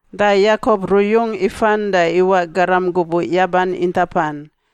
Da Yakop ruyung ifan da iwaꞌ garam gubuꞌ yaban intapan.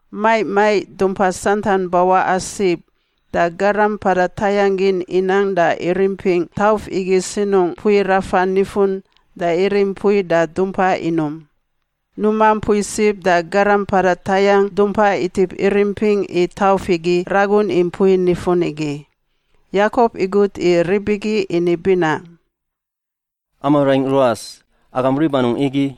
Maiꞌ maiꞌ dumpa santan bawaꞌa sib, da garam mpada tayangꞌ gin inang da irimpingꞌ tauf igi sinungꞌ mpui rafan nifun da irim mpui da dumpa inum. Numa mpui sib da garam mpada tayangꞌ dumpa itip irimpingꞌ i tauf igi ragun i mpui nifun igi. Yakop igut i rib igi ini binaꞌ, “Amaꞌ raingꞌ ruas, agam rib anungꞌ igi?”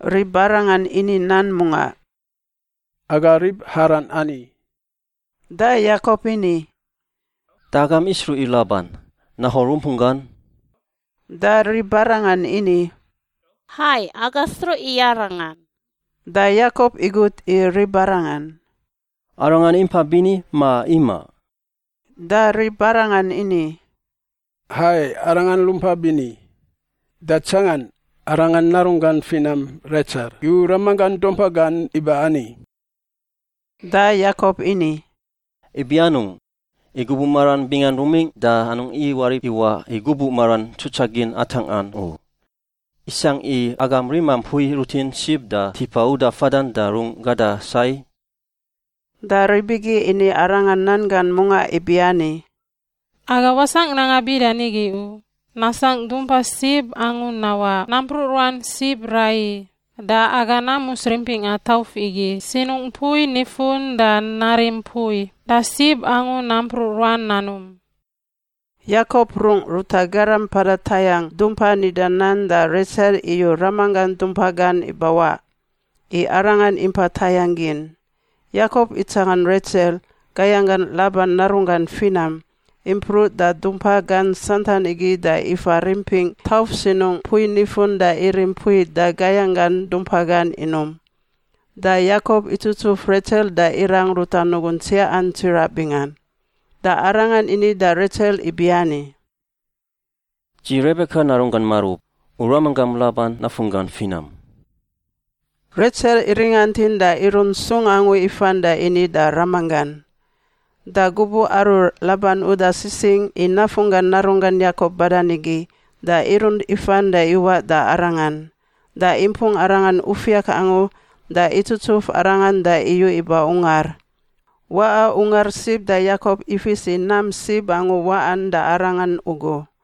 Ribarangan ini nan mungaꞌ, “Aga rib Haran ani.” Da Yakop ini, “Da agam isruꞌ i Laban, Nahor rumpunggan?” Da ribarangan ini, “Hai, aga sruꞌ i arangan.” Da Yakop igut i ribarangan, “Arangan impa bini ma imaꞌ?” Da ribarangan ini, “Hai, arangan rumpa bini. Da tsangan, arangan narunggan finam Retsel iyu ramanggan dumpa gan iba ani.” Da Yakop ini, “Ibi anungꞌ? I gubuꞌ maran bingan rumingꞌ da anungꞌ iwarip iwaꞌ i gubuꞌ maran tsutsagin atangꞌan u. Isangꞌ i agam rima mpui rutin sib da tipa uda fadan da rung gada sai?” Da rib igi ini arangan nan gan mungaꞌ ibiani, “Aga wasangꞌ i nanga bida nigi u, nasangꞌ dumpa sib angu nawaꞌ nampruꞌ ruan sib raiyi da aga namus rimpingꞌa tauf igi sinungꞌ mpui nifun da narim mpui da sib angu nampruꞌ ruan nanum.” Yakop rungꞌ ruta garam mpada tayangꞌ dumpa nida nan da Retsel iyu ramanggan dumpa gan ibawaꞌ, i arangan impa tayangꞌ gin. Yakop itsangan Retsel, gayanggan Laban narunggan finam, impruꞌ da dumpa gan santan igi da ifa rimpingꞌ tauf sinungꞌ mpui nifun da irim mpui da gayanggan dumpa gan inum. Da Yakop itsutsuf Retsel da irang ruta nugun tsiaꞌan tsiraꞌ bingan. Da arangan ini da Retsel ibiani, “Dzi Rebeka narunggan marub, u ramanggam Laban nafunggan finam.” Retsel iringantin da irunt sung angu ifan da ini da ramanggan. Da gubuꞌ aru Laban uda sisingꞌ i nafunggan narunggan Yakop badan igi, da irunt ifan da iwaꞌ da arangan. Da impung arangan ufiak angu da itsutsuf arangan da iyu iba ungar. Waꞌa ungar sib da Yakop ifis i nam sib angu waꞌan da arangan ugu.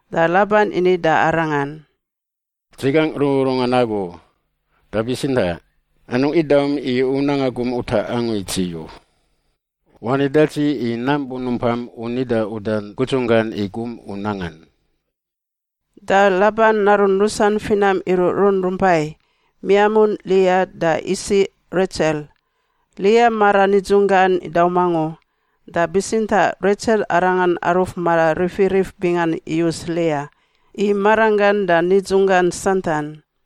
da Laban ini da arangan, “Dzi gangꞌ rururungan agu, da bitsintaꞌ anungꞌ idaum i u nanga gum utaꞌ angu i dzi u. Wani da dzi i nam bunumpam u nida udan gudzunggan i gum u nangan.” Da Laban narun rusan finam iruꞌrun rumpai; miamun Lia da isiꞌ Retsel. Lia mara nidzun gan idaum angu, da bitsintaꞌ Retsel arangan aruf mararifirif bingan iyus Lia i maranggan da nidzunggan santan.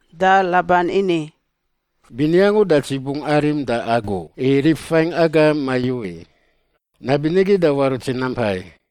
Da Laban ini, “Bini angu da dzi bungꞌ arim da agu i rib fain aga mayu i. Nabinigi da warut dzi nampai.”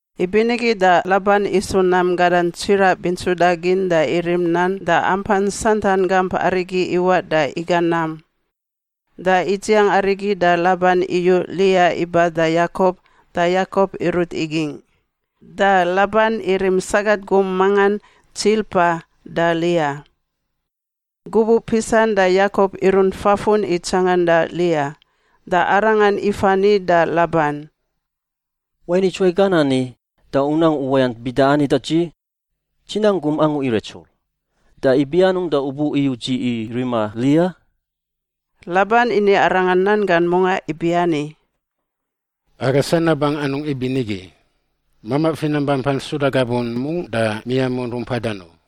Ibinigi da Laban isu nam gadan tsiraꞌ bintsudagin da irim nan da ampan santan gamp arigi iwaꞌ da iga nam. Da idziang arigi da Laban iyu Lia iba da Yakop da Yakop irut igingꞌ. ( Da Laban irim sagat gum mangan, Tsilpa, da Lia.) Gubuꞌ pisan da Yakop irunt fafun i tsanganda Lia. Da arangan ifa ni da Laban, “Wain idzuwai gan ani da u nang uwayant bida ani da dzi? Dzi nang gum angu i Retsel. Da ibi anungꞌ da u bu iyuꞌ dzi i rima Lia?” Laban ini arangan nan gan mungaꞌ ibiani, “Aga sanabangꞌ anungꞌ ibinigi, mamaꞌ finam bampan suda gabun mungꞌ da miamun rumpadan u.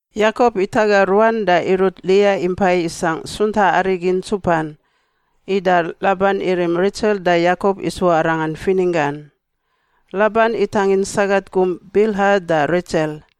Yakop itaga ruan da irut Lia impai isangꞌ suntaꞌ arigi ntsupan. Ida Laban irim Retsel da Yakop isu arangan fininggan. ( Laban itangin sagat gum, Bilha, da Retsel.)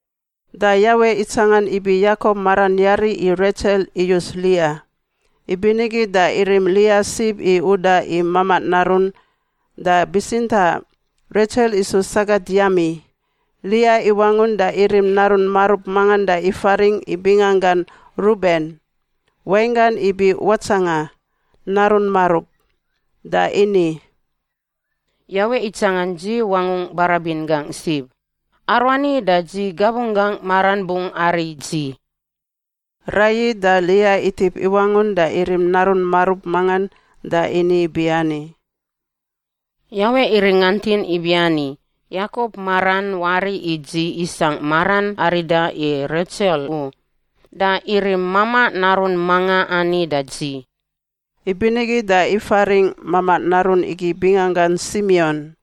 Da Yawe itsangan ibi Yakop maran yari i Retsel iyus Lia, ibinigi da irim Lia sib i uda i mamaꞌ narun. Da bitsintaꞌ Retsel isu sagat yami. Lia iwangun da irim narun marub mangan da ifaringꞌ i binganggan Ruben (wainggan ibi watsanga, narun marub), da ini, “Yawe itsangan dzi wangu barabin gangꞌ sib; aruani da dzi gabunggangꞌ maran bungꞌ ari dzi.” Raiyi da Lia itip iwangun da irim narun marub mangan da ini ibiani, “Yawe iringantin ibiani, Yakop maran wari i dzi isangꞌ maran arida i Retsel u, da irim mamaꞌ narun manga ani da dzi.” Ibinigi da ifaringꞌ mamaꞌ narun igi binganggan Simion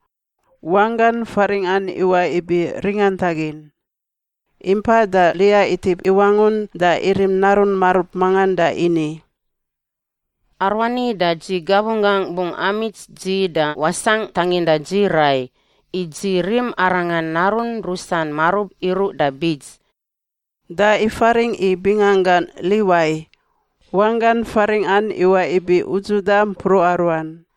(wanggan faringꞌan iwaꞌ ibi ringantagin). Impa da Lia itip iwangun da irim narun marub mangan da ini, “Aruani da dzi gabunggangꞌ bungꞌ amits dzi da wasangꞌ tanginda dzi rai, i dzi rim arangan narun rusan marub iruꞌ da bits,” da ifaringꞌ i binganggan Liwai (wanggan faringꞌan iwaꞌ ibi udzuda mpruꞌa ruan).